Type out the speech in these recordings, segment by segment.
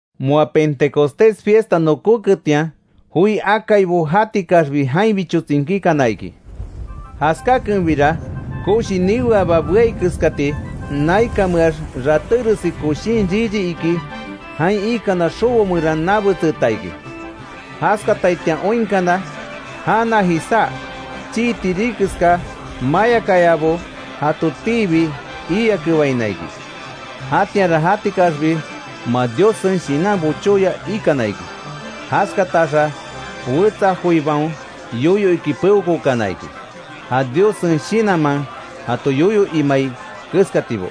Moa Pentecostés fiesta nokóketian, joi akaibo jatikaxbi jainbicho tsinkíkana iki. Jaskákenbira, koshi niweaba beai keskati, naikanmeax ratéresi koshin riri iki jain ikana xobo meran nabetseeta iki. Jaskataitian oinkana, jana jisá chii tiri keská mayakayabo jatotiibi iiakebaina iki. Jatianra jatikaxbi moa Diossen Shinan bochóya ikana iki, jaskataxa wetsa joibaon yoyo iki peokookana iki, ja Diossen Shinanman jato yoyo imai keskatibo.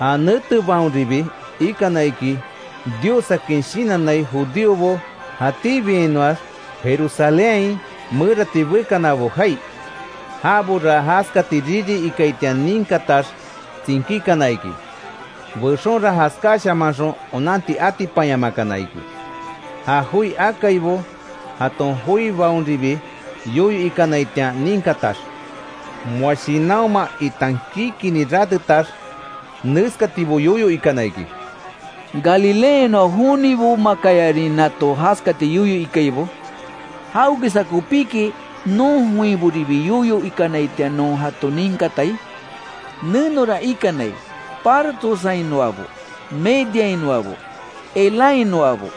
Ja netebaonribi ikana iki Diossakin shinannai judíobo, jatíbiainoax Jerusalénhain merati bekanabo jai. Jabora jaskati riri ikaitian ninkatax tsinkíkana iki. Bexonra jaskáshamanxon onanti atipanyamakana iki, ja joi akaibo jaton joibaonribi yoyo ikanaitian ninkatax. Moa shinanhoma itan kikinni ratetax, neskatibo yoyo ikana iki: —¿Galileainoa jonibomakayarin nato jaskati yoyo ikaibo? ¿Jawekeska kopíki, non joinboribi yoyo ikanaitian non jato ninkatai? Nenora ikanai: Partossainoabo, Mediainoabo, Elamhainoabo,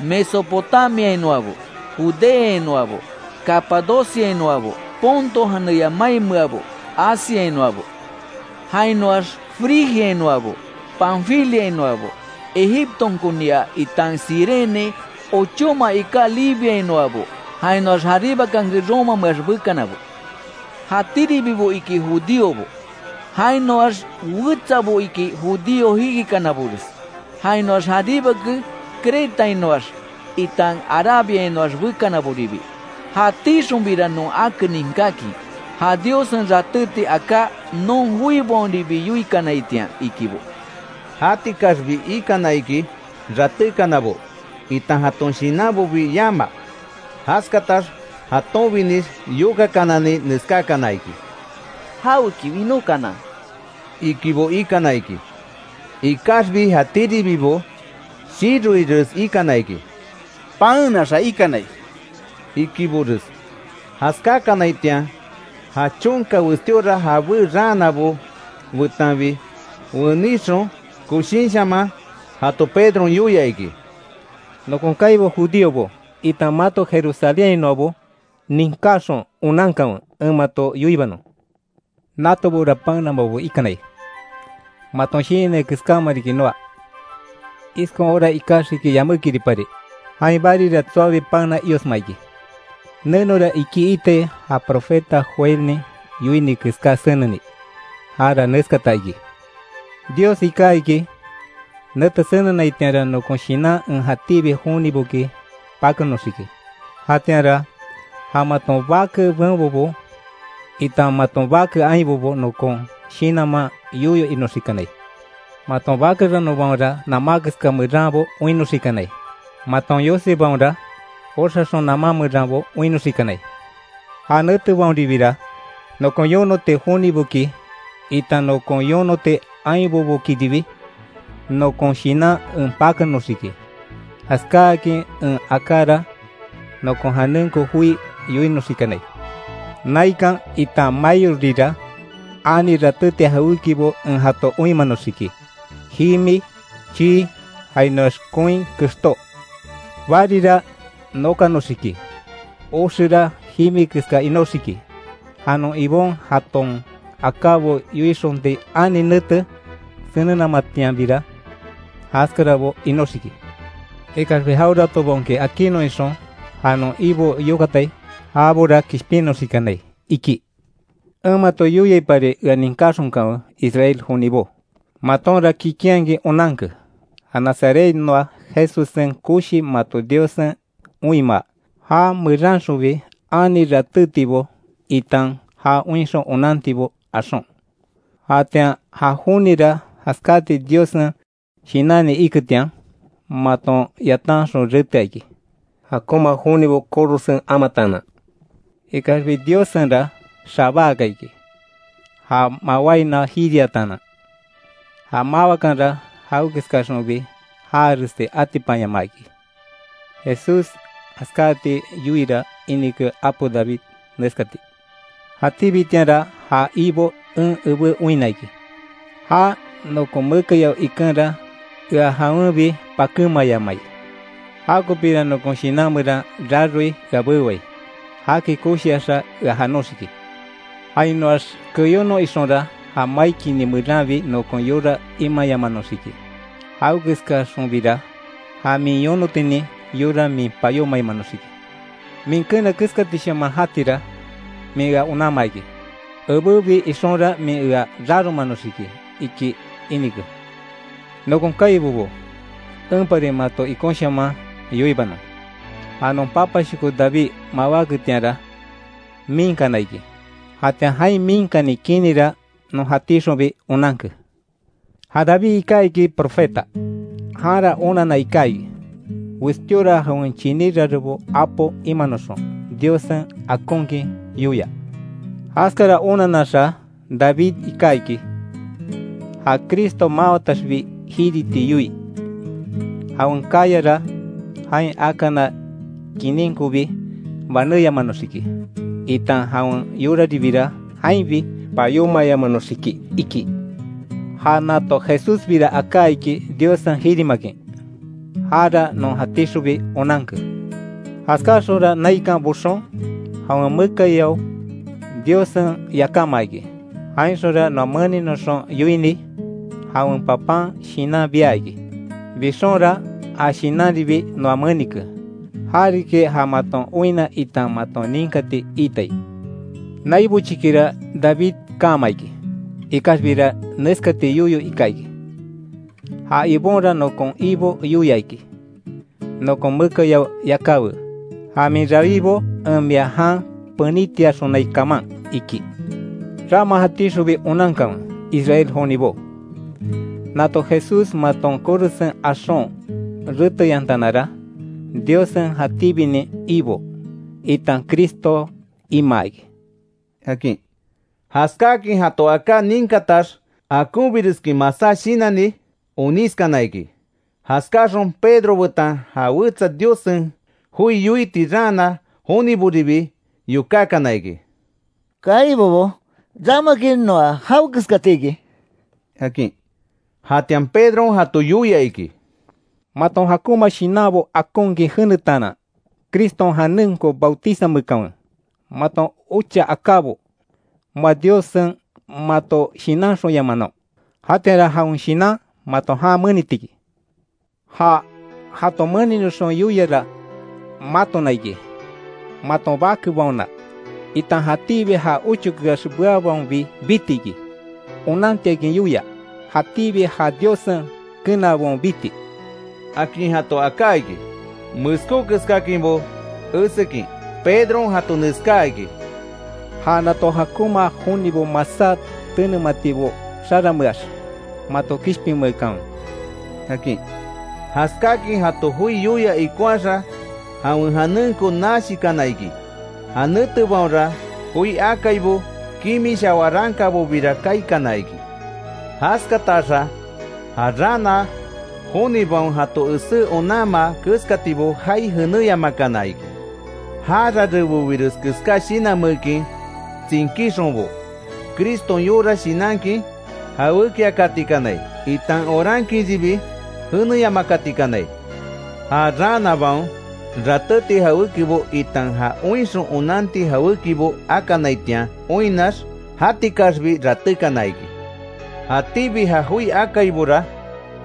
Mesopotamiainoabo, Judeainoabo, Capadociainoabo, Ponto janeya mainmeabo, Asiainoabo, jainoax Frigiainoabo, Panfiliainoabo, Egiptonkonia itan Cirene ochóma iká Libiainoabo. Jainoax, jaribakanke Romameax bekanabo. Jatíribibo iki judíobo, jainoax wetsabo iki judío jikikanabores. Jainoax jaríbake Cretainoax, itan Arabiainoax bekanaboribi. ¡Jatíxonbira non ake ninkákin, ja Diossen ratéti aká non joibaonribi yoikanaitian! —ikibo. Jatikaxbi ikana iki ratékanabo itan jaton shinanbobi yama. Jaskatax jatonbinix yokakanani, neskákana iki: —¿Jaweki winókana? —ikibo ikana iki. Ikaxbi jatíribibo shiroires ikana iki: —¡Paenaxa ikanai! —ikibores. Jaskákanaitian, ja chonka westíora jabé raanabo betanbi, wenixon koshinshaman jato Pedron yoia iki: “Nokon kaibo Judíobo, itan mato Jerusalénhainoabo, ninkáxon, onankanwe en mato yoibanon: Natobora paenamabo ikanai. Maton shinannai keskáma riki noa. Iskon hora ikaxiki yamékiripari, jain barira tsoabi paena iosma iki. Nenora iki itai, ja profeta Joelnin yoini keská seneni. Jara neskata iki: ‘Dios iká iki, nete senenaitianra, nokon Shinan en jatíbi joniboki pakenoxiki; jatianra, ja maton bake benbobo, itan maton bake ainbobo nokon Shinanman yoyo inoxikanai. Maton bake ranonbaonra namá keska meranbo oinnoxikanai. Maton yosibaonra, oxaxon namá meranbo oinnoxikanai. Ja netebaonribira, nokon yonoti joniboki itan nokon yonoti ainbobokiribi, nokon Shinan en pakenoxiki. Jaskáakin en akára, nokon janenko joi yoinoxikanai. Naikan, itan maiorira ani ratéti jawékibo en jato oinmanoxiki; jimi, chii, jainoax koin kextó. Barira nokanoxiki, oxera jimi keska inóxiki, ja non Ibon jaton akábo yoixonti ani nete senenamatianbira, jaskarabo inóxiki. Ikaxbi jaweratobaonki akinnon ixon, ja non Ibo yokatai, jabora kishpinnoxikanai’, iki. En mato yoiaipari ea ninkaxonkanwe Israel jonibo: Matonra kikinhakin onanke, ja Nazarethainoa Jesussen koshi mato Diossen oinmaa, já meranxonbi ani ratétibo itan, ja oinxon onantibo axon. Jatian, ja jonira jaskáti Diossen shinanni iketian, maton yatanxon retea iki, jakonma jonibo korosen amataanan. Ikaxbi Diossenra xabáaka iki, ja mawainoa jiriataanan. Ja mawakanra jawekeskaxonbi jaaresti atipanyamaa iki. Jesús jaskáti yoiira inike apo David, neskati: ‘Jatíbitianra ja Ibo en ebé oinna iki, já nokon mekayao ikenra, ea jawenbi pakémayamai. Jakopíra nokon shinan meran raroi, ea bewai. Jaki koshiaxa ea janoxiki. Jainoax keyónon ixonra, ja mai kini meranbi nokon yora imayamanoxiki. Jawekeskaxonbira, ja min yonotinin yora min payómayamanoxiki. Min keena keskatishaman jatira, min ea onanmaa iki. Ebebi ixonra min ea raromanoxiki’, iki inike. Nokon kaibobo, enpari mato ikonshaman yoibanon; ja non papashoko David mawáketianra, miinkana iki. Jatian jain miinkani kinira non jatíxonbi onanke. Ja David iká iki profeta. Janra onanna iká iki, westíora jawen chiní rarebo apo imanoxon Diossen akonkin yoia. Jaskara onanaxa David iká iki, ja Cristo máwataxbi jiriti yoii, jawen kayara jain akana kininkobi banémayamanoxiki, itan jawen yoraribira jainbi payómayamanoxiki iki. Ja nato Jesúsbira aká iki Diossen jirimakin. Jara non jatíxonbi onanke. Jaskáaxonra naikan boxon, jawen mekayao Diossen yakámaa iki. Jainxonra noa meninoxon yoini, jawen Papán Shinan bia iki. Bixonra, ja Shinanribi noa menike. Ja riki ja maton oinna itan maton ninkati iitai. Nai bochikira David kaama iki, ikaxbira neskati yoyo ika iki: ‘Ja Ibonra nokon Ibo yoia iki. Nokon mekayao yakáwe, Ja min rawibo, en mia jan penítiaxonai kaman’, iki. Rama jatíxonbi onankanwe, Israel jonibo. Nato Jesús maton korosen axon reteyantanara, Diossen jatíbinin Ibo, itan Cristo imaa iki”, akin. Jaskáakin jato aká ninkatax, akonbireskin masá shinanni onískana iki. Jaskáxon Pedro betan ja wetsa Diossen joi yoiti raana joniboribi yokákana iki: —Kaibobo, ¿Ramaki noa jawekeskatiki? —akin. Jatian Pedron jato yoia iki: —Maton jakonma shinanbo akonkin jenetaanan, Criston janenko bautizameekanwe, maton ocha akábo moa Diossen mato shinanxonyamanon, jatianra jawen Shinan mato jan meniti iki. Ja jato meninoxon yoiara matona iki, maton bakebaona, itan jatíbi ja ochokeax beabaonbi biti iki. Onantiakin yoia, jatíbi ja Diossen kenaabaon biti —akin jato aká iki. Meskó keskáakinbo esekin, Pedron jato neskáa iki: —¡Ja nato jakonma jonibo masá tenematibo xarameax, mato kishpinmeekanwe! —akin. Jaskáakin jato joi yoia ikonhaxa, jawen janenko nashikana iki. Ja netebaonra joi akaibo kimisha warankabobira kaikana iki. Jaskataxa, ja raana jonibaon jato esé onanmaa keskatibo jaai jenéyamakana iki. Ja rarebobires keska shinanmeekin, tsinkíxonbo Criston yora shinankin jawékiakatikanai, itan orankinribi jeneyamakatikanai. Ja raanabaon, ratéti jawékibo, itan ja oinxon onanti jawékibo akanaitian oinnax, jatikaxbi ratékana iki. Jatíbi ja joi akaibora,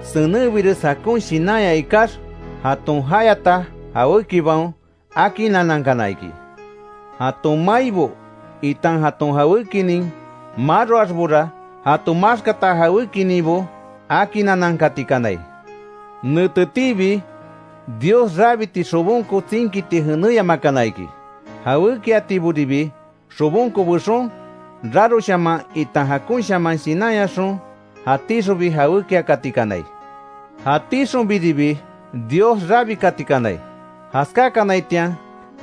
senenbires jakon shinanya ikax, jaton jayata jawékibaon akinanankana iki. Jaton maibo, itan jaton jawékinin maroaxbora, jato maxkata jawékininbo akinanankatikanai. Netetiibi Dios rabiti xobonko tsinkiti jenéyamakana iki, jawékiatiboribi xobonko bexon, raroshaman, itan jakonshaman shinanyaxon, jatíxonbi jawékiakatikanai. Jatíxonbiribi Dios rabikatikanai. Jaskákanaitian,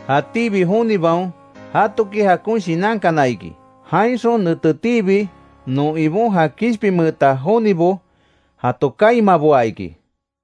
jatíbi jonibaon jatoki jakon shinankana iki. Jainxon netetiibi non Ibon ja kishpinmeeta jonibo jato kaimaboa iki.